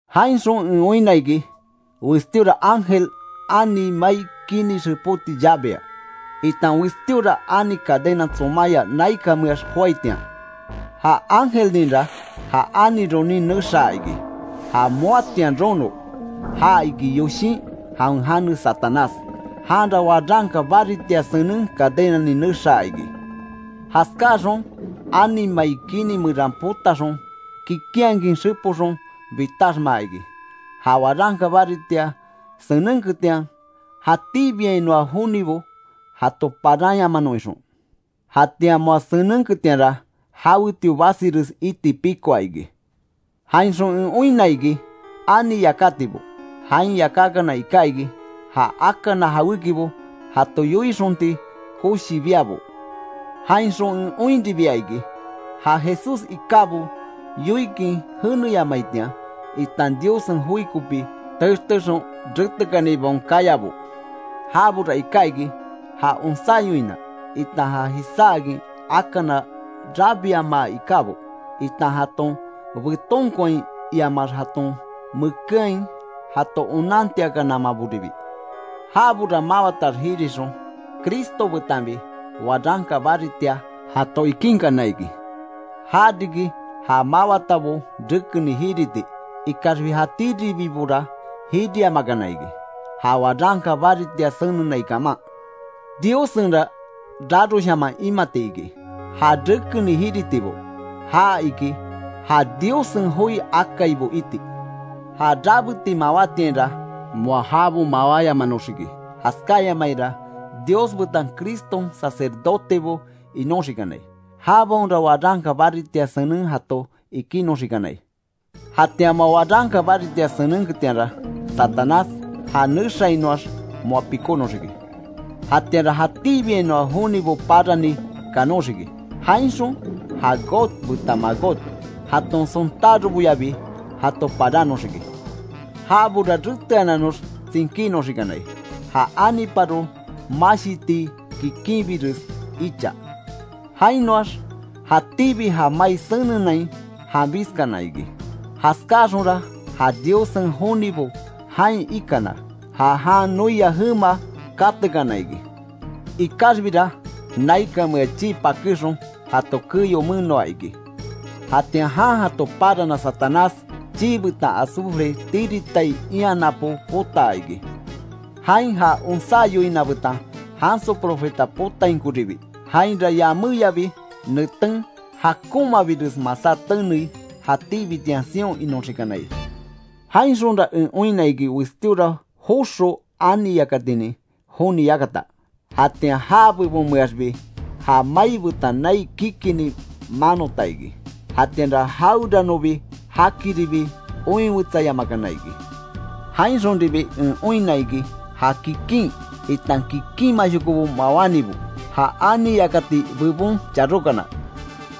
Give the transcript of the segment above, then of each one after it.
Jainxon en oinna iki, westíora ángel ani mai kini xepoti llavea, itan westíora ani cadena tsomaya naikanmeax joaitian. Ja ángelninra ja ani ronin nexaa iki. Ja moatian rono, ja iki yoshin jawen jane Satanás. Janra waranka baritia senen cadenanin nexaa iki. Jaskáxon ani mai kini meran potaxon kikinhakin xepoxon bitaxmaa iki; ja waranka baritia senenketian jatíbiainoa jonibo jato paranyamanon ixon. Jatian moa senenketianra jawetio basires iti pikoa iki. Jainxon en oinna iki ani yakatibo. Jain yakákana iká iki, ja akana jawékibo jato yoixonti koshi biabo. Jainxon en oinribia iki, ja Jesús ikábo yoikin jeneyamaitian, itan Diossen joi kopi textexon retekanibaon kayabo. Jabora iká iki ja onsá yoina, itan já jisáakin akana rabiamaa ikábo, itan jaton betonkoain iamax jaton mekeain jato onantiakanamaboribi. Jabora mawatax jirixon Cristo betanbi waranka baritia jato ikínkana iki. Ja riki ja mawatabo rekeni jiriti, ikaxbi jatíribibora jiriamakana iki ja waranka baritia senenai kaman. ¡Diossenra raroshaman imati iki, ja rekeni jiritibo. Ja iki ja Diossen joi akaibo iti! Ja rabeti mawátiainra moa jabo mawáyamanoxiki; jaskáyamaira Dios betan Criston sacerdotebo inoxikanai. Jabaonra waranka baritia senen jato ikinoxikanai. Jatian moa waranka baritia senenketianra, Satanás ja nexainoax moa pikónoxiki. Jatianra jatíbiainoa jonibo parani kanoxiki. Jainxon ja Gog betan Magog jaton sontároboyabi jato parannoxiki. Jabora reteananox tsinkínoxikanai; ja aniparo mashitii kikinbires icha. Jainoax jatíbi ja mai senenain janbiskana iki. Jaskáxonra ja Diossen jonibo jain ikana, ja jan noia jema katekana iki. Ikaxbira naikanmea chii pakéxon jato keyo menoa iki. Jatian jan jato parana Satanás, chii betan azufre tiritai ian napo potaa iki. Jain ja onsá yoina betan janso profeta potainkoribi. Jainra yaméyabi neten jakonmabires masá tenei, jatíbitian sion inoxikanai. Jainxonra en oinna iki westíora joxo ani yakatinin joni yakata. Jatian já bebonmeaxbi ja mai betan nai kikini manota iki; jatianra jaweranobi jakiribi oinwetsayamakana iki. Jainxonribi en oinna iki, ja kikin, itan kikinshokobo mawánibo, ja ani yakati bebon charókana.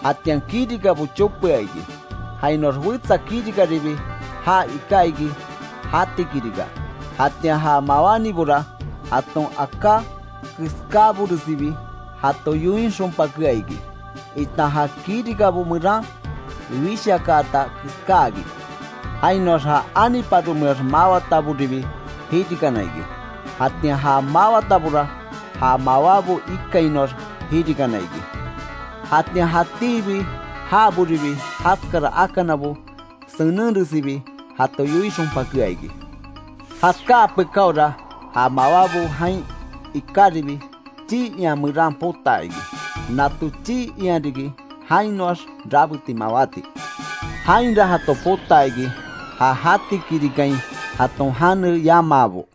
Jatian kirikabo chopea iki, jainoax wetsa kirikaribi ja iká iki jati kirika. Jatian ja mawánibora jaton aká keskáboresibi jato yoixonpakea iki, itan ja kirikabo meran wishakaata keskáakin. Jainoax ja aniparomeax mawataboribi jirikana iki, jatian ja mawatabora ja mawábo ikainoax jirikana iki. Jatian jatíbi jaboribi jaskara akanabo senenresibi jato yoixonpakea iki. Jaskáa pekáora ja mawábo jain ikáribi, chii ian meran potaa iki. Nato chii ian riki jainoax rabeti mawáti. Jainra jato potaa iki ja jati kirikain jaton jane yamaabo.